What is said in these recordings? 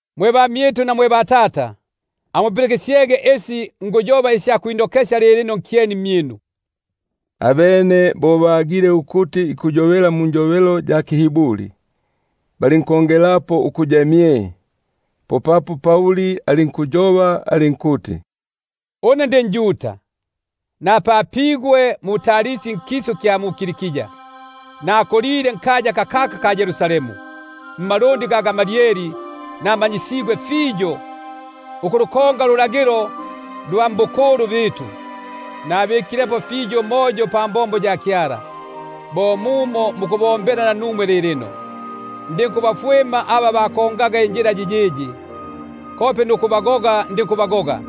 Mwe bamyitu na mwe batata, amupilikisyege isi nikwilongela lilino nkyeni mmyinu. Abene bo bagile ukuti ikuyobela munjobelo ya kiHiburi, balinkongelapo ukuya mye. Popapo alinkuti: Une ndi njuda, napapigwe mu-Tarsi nkisu kya mu-Kilikia; nakulile nkaya kakaka mmalundi ga Gamalieli, namanyisigwe fiyo ukufikapo ndulagilo lwa batata; mbikilepo fiyo umoyo pambombo ya Kyala, bo muno muku- bombela nanumwe lilino. Ndinkubafwima aba bendaga injila yiyiyi, kope nukubagoga ndinkubagoga;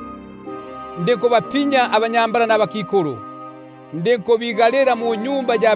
ndinkubapinya abanyambala nabakikulu, ndinkubabika munyumba ya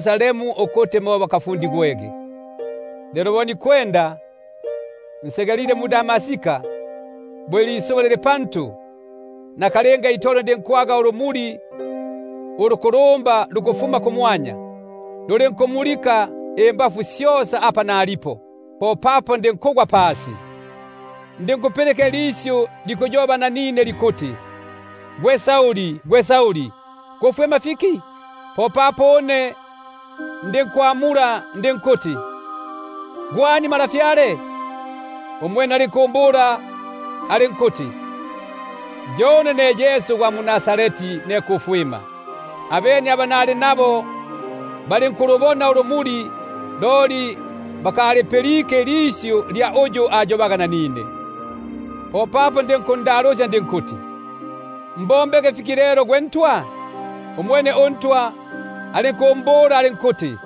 salemu ukuti mo bakafundigwege. Lelo bo nikwenda, nsegelile mu-Damaska, bo ilisuba liliti lili pantu, nakalinga itolo ndinkwaga ulumuli ulukulumba lukufuma kumwanya, luli- nkumulika ukusyungutila apa nalipo. Popapo ndinkugwa pasi, ndinkupilika ilisyu likuyoba nanine likuti: Gwe Sauli, gwe Sauli, kufwima fiki une? Popapo une ndinkwamula ndinkuti: Gwe ani, gwe Ntwa? Umwene alinkumbula alinkuti: Yo une Yesu gwa mu-Nazareti ne kufwima. Abene aba nali nabo balinkulubona ulumuli, loli ilisyu lya uyu ayobaga nanine, lyo balinkusita nukulipilika. Popapo ndinkundalusya ndinkuti: Mbombe fiki lelo gwe Ntwa? Umwene uNtwa alinkumbula alinkuti: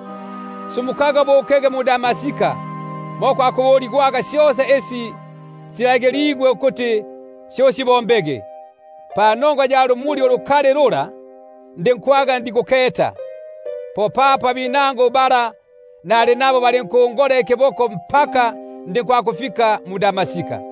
Sumukaga ubukege mu-Damaska, mo kwakubuligwaga syosa isi silagiligwe ukuti syo usibombege. Lelo bo ngwaga ndikuketa panongwa ya busisya bwa lumuli lula, popapo aba nali nabo balinkungola ikiboko, ndinkwakufika mu-Damaska.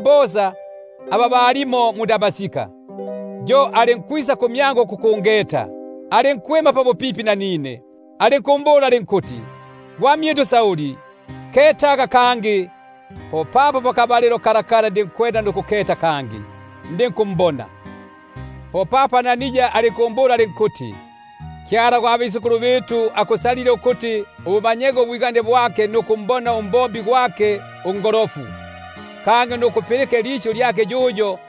bosa aba bali mumo, yo alinkwisa kumyangu, alinkwima pabupipi nanine, alinkumbula alinkuti: Gwamyitu Sauli, ketaga kangi! Popapo pakabalilo kako itolo ndinkuketa kangi, ndinkumbona. Popapo umwene alinkumbula alinkuti: Kyala gwa batata, akusalile ukuti ubumanye ubwigane bwake, nukumbona uNgolofu, kangi nukulipilika ilisyu ili likufuma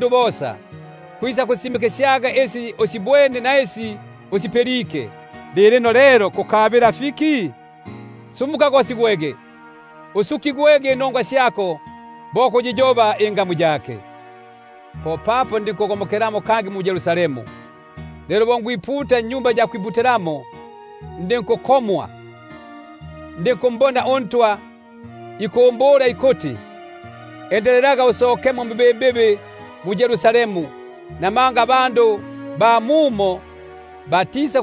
bosa, muli isi usibwene, nisi usipilike. Lilino lelo, kukabila fiki? Sumukaga gosigwege, usukigwege inongwa syako, bo kuyiyoba ingamu yake. Lelo bo mbyanilemo kangi mu-Yerusalemu, bo nikwiputa mwa Tempeli, popapo ndinku- komwa, ndinkumbona umwene ikuyoba nanine ikuti: Endelelaga usokemo mbibimbibi mu-Yerusalemu, buno batisa-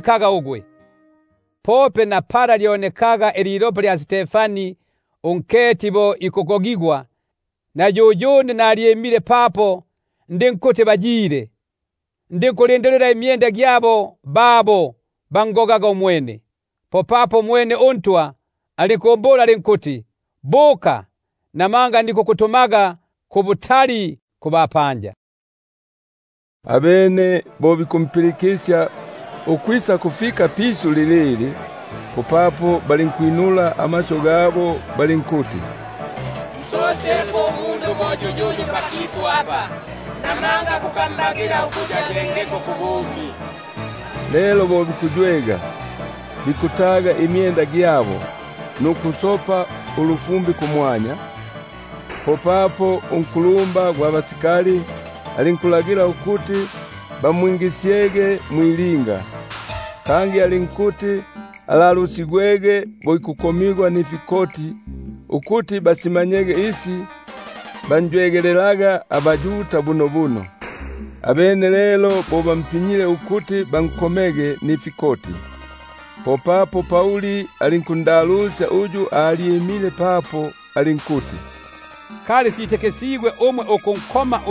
kaga ugwe. Pope na pala lyonekaga ililopa lya Stefani unketi gwako, na yuyune nalyimile papo ndinkuti bayile, ndinku- lindilila imyenda gya babo bangogaga umwene. Popapo umwene alinkumbula alinkuti: Bukaga, namanga nikukutumaga kubutali kubapanja. Abene balinkumpilikisya ukwisakufika pisyu lilili, popapo balinkwinula amasyu gabo balinkuti: Nsosyepo umundu bo yuyuyu pakisu apa; namanga kukambagila ukuti ayengeko kubumi. Lelo bo bikuywega, bikutaga imyenda gyabo nuku- sopa ulufumbi kumwanya, popapo unkulumba gwa basikali alinkulagila ukuti bamwingisyege mwilinga, kangi alinkuti alalusigwege bo ikukomigwa nifikoti, ukuti basyage isi banjwe- gelelaga bunobuno. Abene lelo bo bampinyile ukuti bankomege nifikoti, popapo Pauli alinkundalusya sarjenti uyu alyimile papo alinkuti: Kali sitikisigwe umwe ukunkoma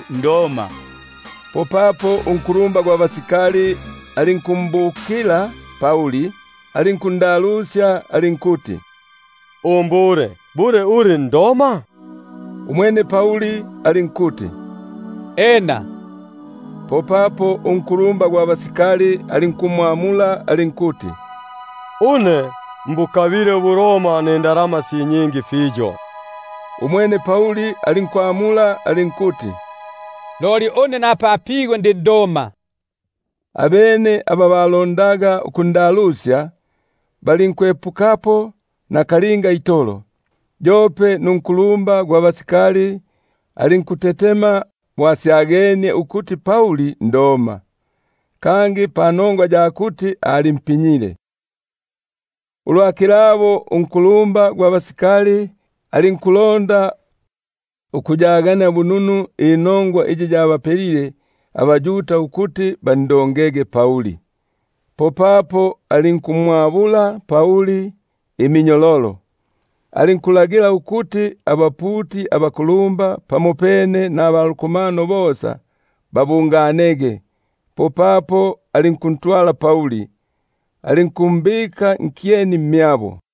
nDoma? Popapo unkulumba gwa basikali alinkwisa, alinkundalusya alinkuti: Umbule, bule uli nDoma? Umwene alinkuti: Ena. Popapo unkulumba gwa basikali alinkwamula alinkuti: Une mbukabile ubuRoma nindalama nyingi fiyo; umwene Pauli alinkuti: Na ku kupapigwa une ndi nDoma itolo. Abene aba balondaga ukundalusya balinkwepukapo nakalinga itolo, yope nunkulumba gwa basikali alinkutetema bo asyagenie ukuti nDoma, kangi panongwa ya kuti alimpinyile. Lelo ulwa kilabo, bo ikulonda ukuyagania bununu inongwa iyi yabapelile abaYuda ukuti bandongege, popapo alinkumwabula, alinkulagila ukuti abaputi abakulumba pamopene naba lukomano bosa babungane; popapo alinkusuluka nagwe Pauli, alinkumbika nkyeni mmyabo.